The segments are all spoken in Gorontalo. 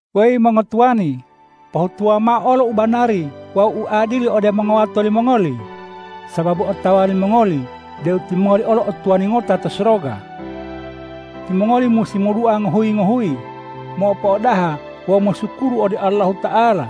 Weyi mongotuwani, pohutuwa mao u banari wawu u adili ode mongowato limongoli, sababu otawa limongoli deu timongoli olo o Tuwani ngota to soroga. Timongoli musi modua ngohuyi-ngohuyi, mopo'odaha wawu mosukuru ode Allahuta'ala.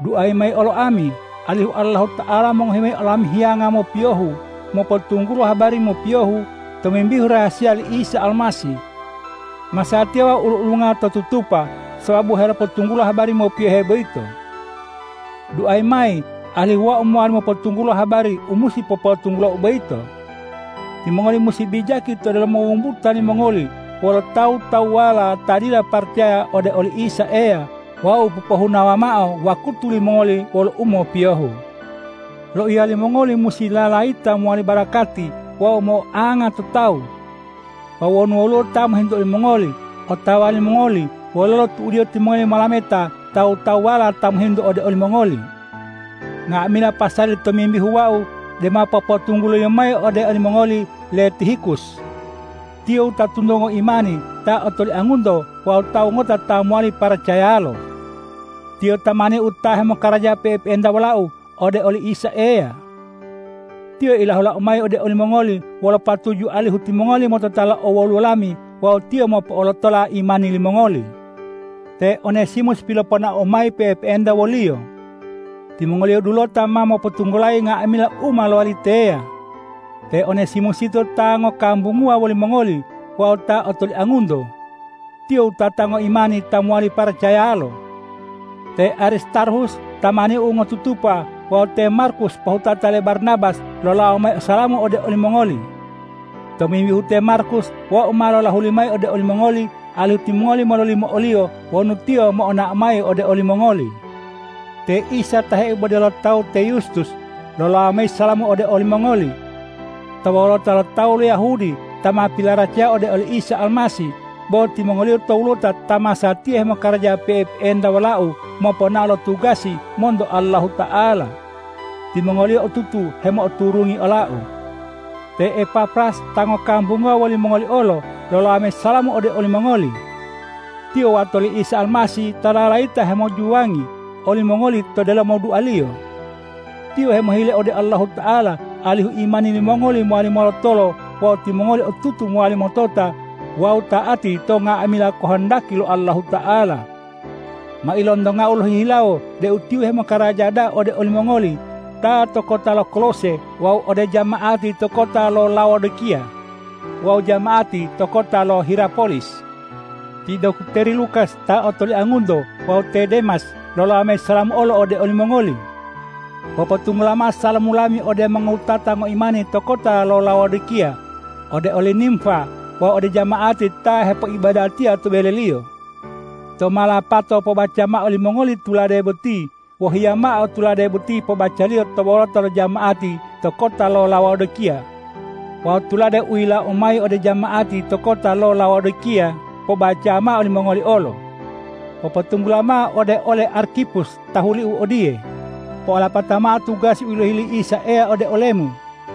Duayi mayi olo ami, alihu Allahuta'ala mongohi mayi olami hiyanga mopiyohu mopotunggulo habari mopiyohu tomimbihu rahasiya li Isa Almasih. Masatiya wau ulu-ulunga to tutupa sababu helopotunggulo habari mopiyohe boyito. Duayi mayi, alihu wau mowali mopotunggulo habari u musi popotunggulou boyito. Timongoli musi bijaki to delomo wumbuta limongoli wolo tawu-tawuwala ta dila paracaya ode oli Isa Eya wawu popohunawa mao wakutu limongoli wolo umopiyohu. Loiya limongoli musi lalayita mowali barakati wawu mo'oanga to tawu. Wawu wonu woluwo ta mohintu olimongoli, otawa limongoli wololo tu'udiyo timongoli molameta tawu-tawuwala ta mohintu ode olimongoli. Nga'amila pasali tomimbihu wau dema popotungguloliyo mayi ode olimongoli le Tihikus. Tiyo wutatunto ngoimani ta otoliangunto wawu tawu ngota ta mowali paracayalo. Tiyo tamaniu ta hemokaraja pe'epe'enta wolau ode oli Isa Eya. Tiyo ilahulau mayi ode olimongoli wolo patuju alihu timongoli motota lo owoluwo lami wawu tiyo mopo'olotola imani limongoli. Te Onesimus piloponaou mayi pe'epe'enta woliyo. Timongoliyo dulota ma mopotunggulayi nga'amila u ma lowali teya. Te Onesimus yito ta ngokambunguwa wolimongoli wawu ta otoliangunto. Tiyo wutata ngoimani ta mowali paracayalo. Te Aristarhus tamaniu ngotutupa wawu te Markus pohutata le Barnabas lolawo mayi salamu ode olimongoli. Tomimbihu te Markus wau ma lolahuli mayi ode olimongoli, alihu timongoli mololimo oliyo wonu tiyo mo'onao mayi ode olimongoli. Te Isa ta heibode lo tawu te Yustus, lolawo mayi salamu olo ode olimongoli. To wolota lo tawu lo Yahudi ta ma pilaracaya ode oli Isa Almasih, bo timongoliyo towulota ta masatiya hemokaraja pe'epe'enta wolau moponao lo tugasi monto Allahuta'ala. Timongoliyo otutu hemo'oturungi olau. Te Epafras ta ngokambunguwa wolimongoli olo, lolawo mayi salamu ode olimongoli. Tiyo wato li Isa Almasih ta lalayita hemojuwangi olimongoli to delomo dualiyo. Tiyo hemohile ode Allahuta'ala alihu imani limongoli mowali molotolo wawu timongoli otutu mowali motota wawu ta'ati to nga'amila kohondaki lo Allahuta'ala. Ma ilontongau lohihilawo deu tiyo hemokaraja da'a ode olimongoli ta to kota lo Kolose wawu ode jama'ati to kota lo Laodikiya wawu jama'ati to kota lo Hirapolis. Ti dokteri Lukas ta otoliangunto wawu te Demas, lolawo mayi salamu olo ode olimongoli. Popotunggula mao salamu lami ode mongowutata ngoimani to kota lo Laodikiya, ode oli Nimfa wawu ode jama'ati ta hepoibadatiya to beleliyo. Tou ma lapato pobaca mao limongoli tulade boti, wohiya mao tulade boti pobacaliyo to wolota lo jama'ati to kota lo Laodikiya. Wawu tulade u yilawou mayi ode jama'ati to kota lo Laodikiya, pobacawa mao limongoli olo. Popotunggula mao ode ole Arkipus tahuliu odiye,”Po'olapata mao tugasi u yilohi li Isa Eya ode olemu.”